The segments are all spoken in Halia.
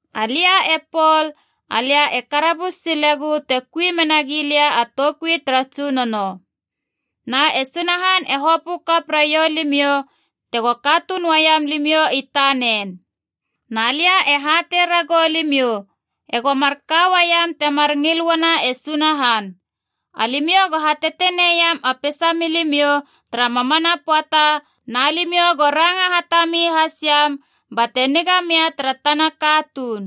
Alia e Pol, alia e karabus silegu te kui menagi lia a toukui tara Tsunono. Na e Sunahan e hopö kap raiou limiou tego katuun uaiam limiou i tanen. Na lia e hatei ragou limiou ego marka uaiam temar ngil uana e Sunahan. Alimiou go hatetenei iam a peisa milimiou tara mamana pöata na limiou go ranga hatami hasiam bate niga mia tara tana katuun.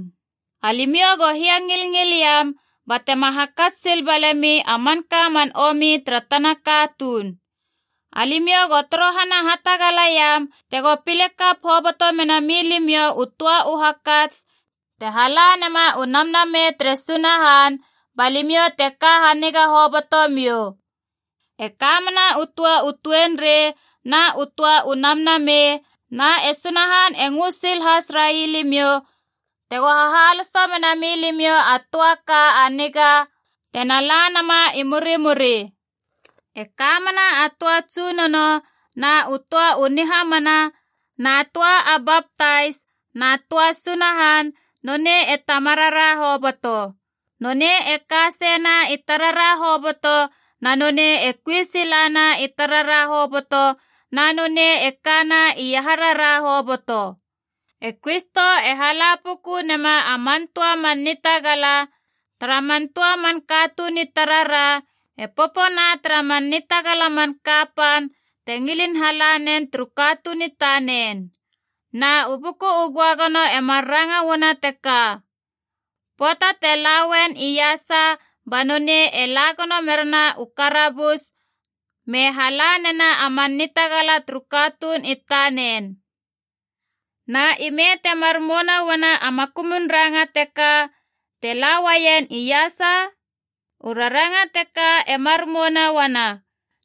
Alimiou go hiangilngil iam batema hakats sil balemi a manka man omi tara tana katuun. Alimiou go torohana hatagala iam tego pile kap hoboto mena milimiou u töa u hakats te hala nema u Namnamei tere Sunahan, ba limiou te ka haniga hobotomiou. E ka mena u töa u tuenrei na u töa u namnamei, na e Sunahan e ngö sil has railimiou tego hahaloso mena milimiou a töa ka a niga tena la nama i murimuri. E ka mena a töa Tsunono na u töa u nihamana na töa a baptais na töa Sunahan, nonei e Tamarara hoboto. Nonei e ka seina i tarara hoboto na nonei e kui silana i tarara hoboto na nonei e kana iaharara hoboto. E Kristo e hala puku nema a man töa man nitagala tara man töa man katuun i tarara e popona tara man nitagala man kapan te ngilin hala nen turu katuun i tanen. Na u Buku u Göagono e mar ranga uana teka: “Pöata te la uen iasa ba nonei e la gono merena u karabus, me hala nena a man nitagala turu katuun i tanen.” Na ime temar mouna uana a makumun ranga teka, “te la uaien iasa”? U raranga teka e mar mouna uana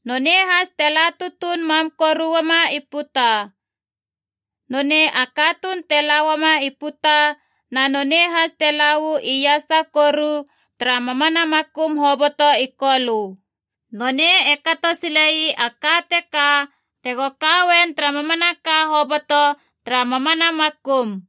nonei has te la tutuun mam koru uama i puta. Nonei a katuun te la uama i puta na nonei has te la uu iasa koru tara mamana makum hoboto i kolö. Nonei e kato sile ii a ka teka tego ka uen tara mamanaka hoboto tara mamana makum.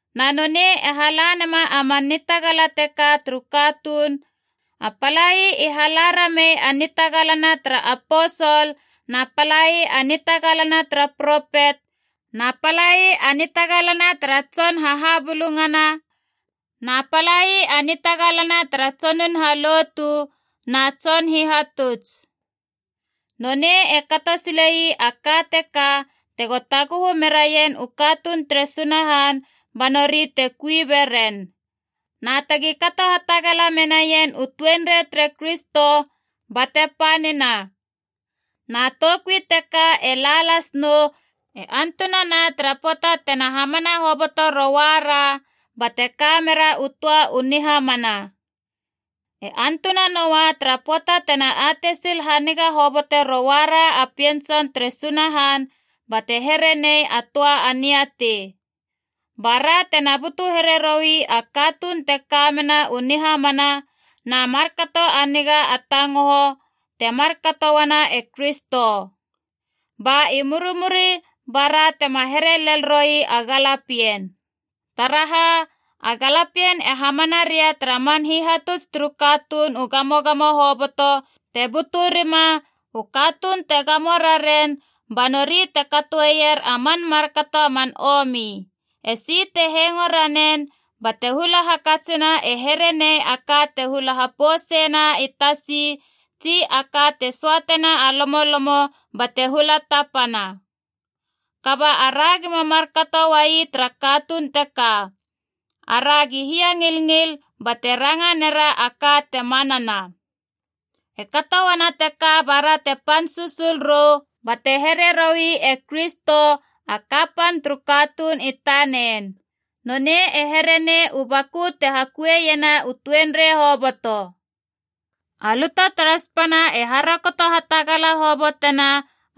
Na nonei e hala nema a man nitagala teka turu katuun: a palai i hala ramei a nitagalana tara aposol, na palai a nitagalana tara propet, na palai a nitagalana tara tson hahabulungana, na palai a nitagalana tara tsonun halotu na tson hihatuts. Nonei e kato silei a ka teka tego taguhu meraien u katuun tere Sunahan ba nori te kui beren. Na tegi kato hatagala menaien u tuenrei tere Kristo a bate panina. Na toukui teka e la lasnou e antunana tara pöata tena hamana hoboto rouara bate ka mera u töa u nihamana. E antunanoa tara pöata tena atei sil haniga hobote rouara a Pien Tson tere Sunahan bate here nei a töa a niatei. Ba ra tena butu here roi a katuun te ka mena u nihamana na markato a niga a tangoho, te markato uana e Kristo. Ba i murimuri bara tema here lele roi a galapien. Taraha, a galapien e hamana ria tara man hihatuts turu katuun u gamogamo hoboto te butu rima, u katuun te gamo raren ba nori te katoeier a man markato a man omi. Esi te hengo ranen bate hula hakatsina e here nei a ka te hula hapouseina i tasi, tsi a ka te söatena a lomolomo bate hula tapana. Kaba ara gima markato uai tara katuun teka. Aragi hiangilngil bate ranga nera a ka te manana. E kato uana teka ba ra te pan susul rou bate here roi e Kristo, a kapan turu katuun i tanen. Nonei e here nei u baku te hakuiena u tuenrei hoboto. A luta tara spana e harokoto hatagala hobotena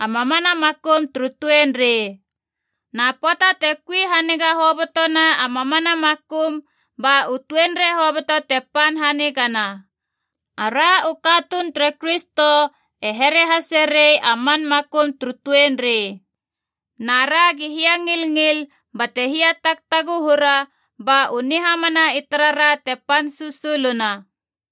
a mamana makum turu tuenrei. Na pöata te kui haniga hobotona a mamana makum, ba u tuenrei hoboto te pan hanigana. Ara u katuun tere Kristo e here hase rei a man makum turu tuenrei. Na ragi hiangilngil bate hiatagtaguhura ba u nihamana i tarara te pan susuluna.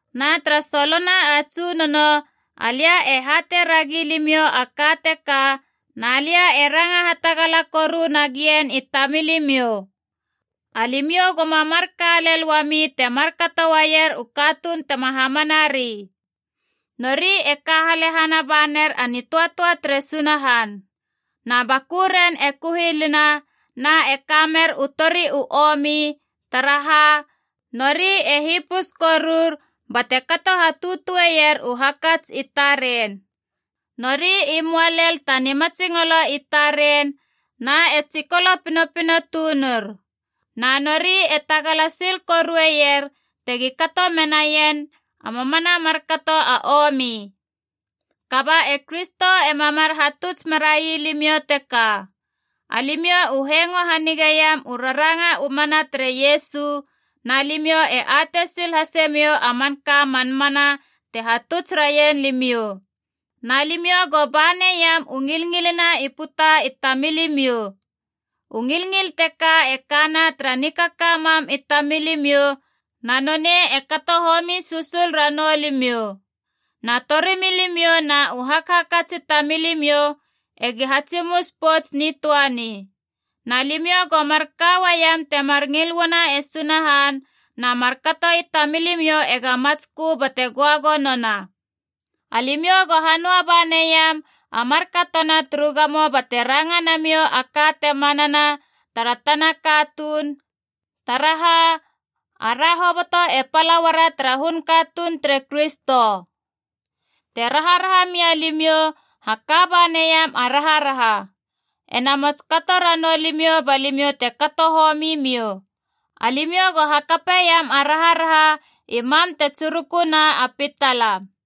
Na tara solona a Tsunono alia e hatei ragi limiou a ka teka, na lia e ranga hatagala koru nagien i tamilimiou. Alimiou goma marka lel uami te markato uaier u katuun tema hamanari. Nori e ka halehana ba ner a nitöatöa tere Sunahan. Na bakuren e kuhilina na e kamer u tori u omi, taraha, nori e hipus korur bate kato hatutueier u hakats i taren. Nori i möa lel ta nimatsingolo i taren, na e tsikolo pinopino tunur. Na nori e tagala sil korueier tegi kato menaien a mamana markato a omi. Kaba e Kristo ema mar hatuts merai limiou teka. Alimiou u hengo hanigeiam u raranga u mana tere Iesu, na limiou e atei sil hasemiou a manka a man mana te hatuts raien limiou. Na limiou go ba neiam u ngilngilina i puta i tamilimiou. U ngilngil teka e kana tara nikaka mam i tamilimiou na nonei e kato homi susul ranou limiou. Na torimilimiou na u hakhakats i tamilimiou egi hatsimus pouts nitöani. Na limiou go marka uaiam temar ngil uana e Sunahan, na markato i tamilimiou ega matskö bate göagonona. Alimiou go hanöa ba neiam a markatona turu gamo bate ranga namiou a ka te manana tara tana katuun, taraha ara hoboto e pala uara tara hun katuun tere Kristo. Te raharaha mia limiou, haka ba neiam a raharaha. Ena mots kato ranou limiou ba limiou te kato homi miou. Alimiou go hakapeiam a raharaha i mam te tsiruku na a pitala.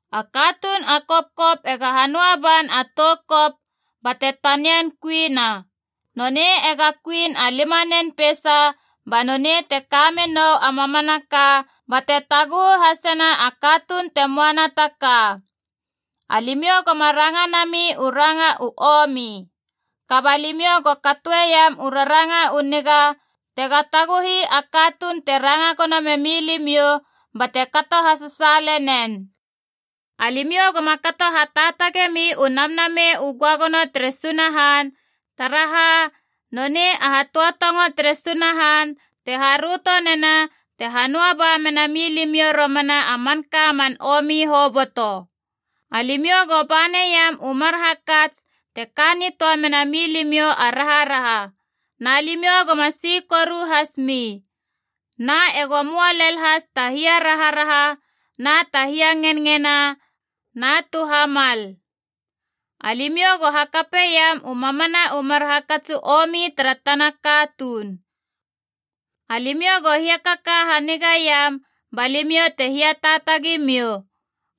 A katuun a kopkop ega hanöa ban a tou kop bate tanian kuina. Nonei ega kuin a limanen peisa, ba nonei te ka menou a mamanaka bate taguhu hasena a katuun te moana ta ka. Alimiou goma ranga nami u ranga u omi. Kaba limiou go katoeiam u raranga u niga tega taguhi a katuun te ranga gono memi limiou, bate kato hasasaale nen. Alimiou goma kato hataatagemi u Namnamei u Göagono tere Sunahan, taraha nonei a hatöatongo tere Sunahan te haröto nena te hanöa ba mena milimiou romana a manka man omi hoboto. Alimiou go ba neiam u mar hakats te ka nitöa menami limiou a raharaha. Na limiou goma si koru has mi. Na ego möa lel has ta hiaraharaha na ta hiangenngena na tu hamal. Alimiou go hakapeiam u mamana u mar hakats u omi tara tana katuun. Alimiou go hiakaka hanigaiam ba limiou te hiataatagi miou.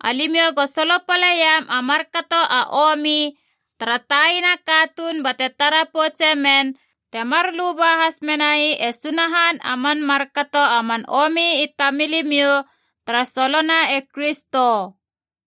Alimiou go solopaleiam a markato a omi tara taina katuun bate tara poutse men, temar luba has menai e Sunahan a man markato a man omi i tamilimiou tara solona e Kristo.